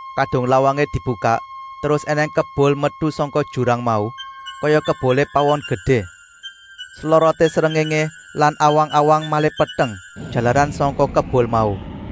Kadung lawangé dibukak, terus ènèng kebul metu sangka jurang mau, kaya kebulé pawon gedé. Sloroté srengéngé lan awang-awang malih peteng, jalaran sangka kebul mau.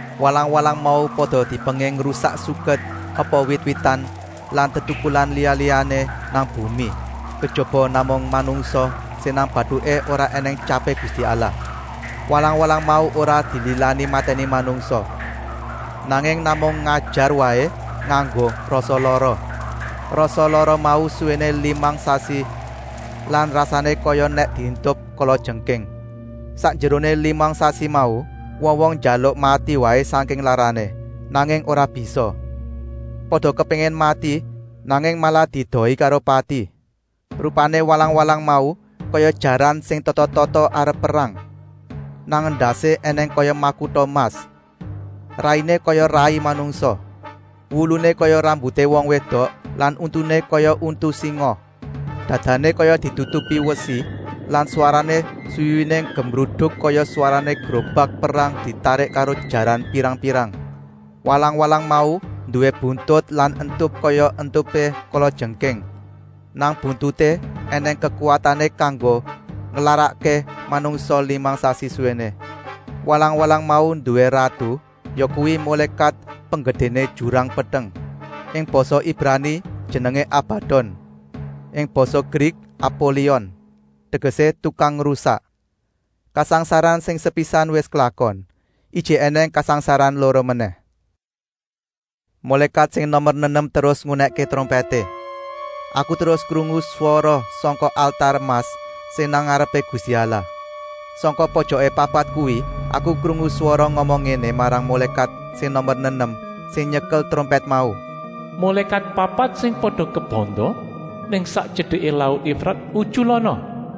Walang-walang mau pada dipenging ngrusak suket apa wit-witan lan tetukulan liya-liyané nang bumi, kejaba namung manungsa sing nang batuké ora ènèng tyapé Gusti Allah. Walang-walang mau ora dililani matèni manungsa, nanging namung ngajar waé nganggo rasa lara. Rasa lara mau suwéné limang sasi lan rasané kaya nèk dientup kalajengking. Sakjeroné limang sasi mau wong-wong njaluk mati waé sangking larané, nanging ora bisa. Pada kepéngin mati, nanging malah diedohi karo pati. Rupané walang-walang mau kaya jaran sing tata-tata arep perang. Nang endasé ènèng kaya makuta emas. Rainé kaya rai manungsa. Wuluné kaya rambuté wong wédok lan untuné kaya untu singa. Dadané kaya ditutupi wesi lan swarané swiwiné gemruduk kaya swarané grobak perang ditarik karo jaran pirang-pirang. Walang-walang mau nduwé buntut lan entup kaya entupé kalajengking. Nang buntuté ènèng kekuwatané kanggo nglarakké manungsa limang sasi suwéné. Walang-walang mau nduwé ratu, yakuwi mulékat penggedéné jurang peteng. Ing basa Ibrani jenengé Abadon, ing basa Grik Apolion, tegesé tukang ngrusak. Kasangsaran sing sepisan wis klakon. Ijik ènèng kasangsaran loro menèh. Mulékat sing nomer nenem terus ngunèkké trompèté. Aku terus krungu swara sangka altar emas sing nang ngarepé Gusti Allah. Sangka pojoké papat kuwi aku krungu swara ngomong ngéné marang mulékat sing nomer nenem sing nyekel trompèt mau: “Mulékat papat sing pada kebanda nang sak tyedeké laut Efrat utyulana.”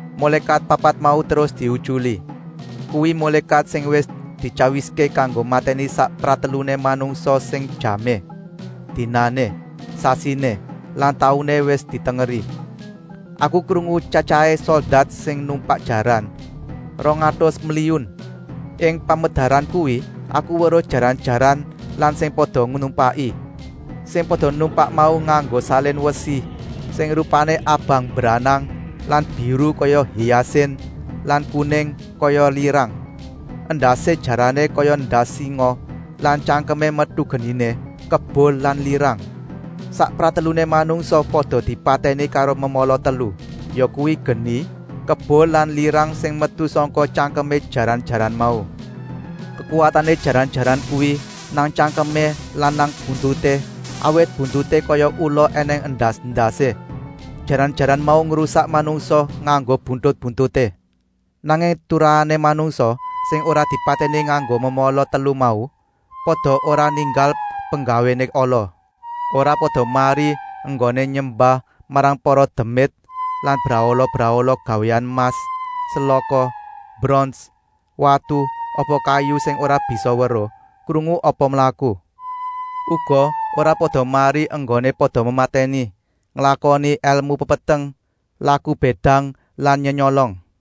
Mulékat papat mau terus diutyuli. Kuwi mulékat sing wis dityawiské kanggo matèni sak prateluné manungsa sing jamé, dinané, sasiné lan tauné wis ditengeri. Aku krungu tyatyahé soldat sing numpak jaran, rong atus mliyun. Ing pamedaran kuwi aku weruh jaran-jaran lan sing pada numpaki. Sing pada numpak mau nganggo salin wesi sing rupané abang mbranang lan biru kaya hiyasin lan kuning kaya lirang. Endasé jarané kaya endas singa lan tyangkemé metu geniné, kebul lan lirang. Sak prateluné manungsa pada dipatèni karo memala telu, yakuwi geni, kebul lan lirang sing metu sangka tyangkemé jaran-jaran mau. Kekuwatané jaran-jaran kuwi nang tyangkemé lan nang buntuté, awit buntuté kaya ula ènèng endas-endasé. Jaran-jaran mau ngrusak manungsa nganggo buntut-buntuté. Nanging turahané manungsa, sing ora dipatèni nganggo memala telu mau, pada ora ninggal penggawéné ala. Ora pada mari enggoné nyembah marang para demit lan brahala-brahala gawéan emas, selaka, brons, watu apa kayu sing ora bisa weruh, krungu apa mlaku. Uga ora pada mari enggoné pada mematèni, nglakoni èlmu pepeteng, laku bédang lan nyenyolong.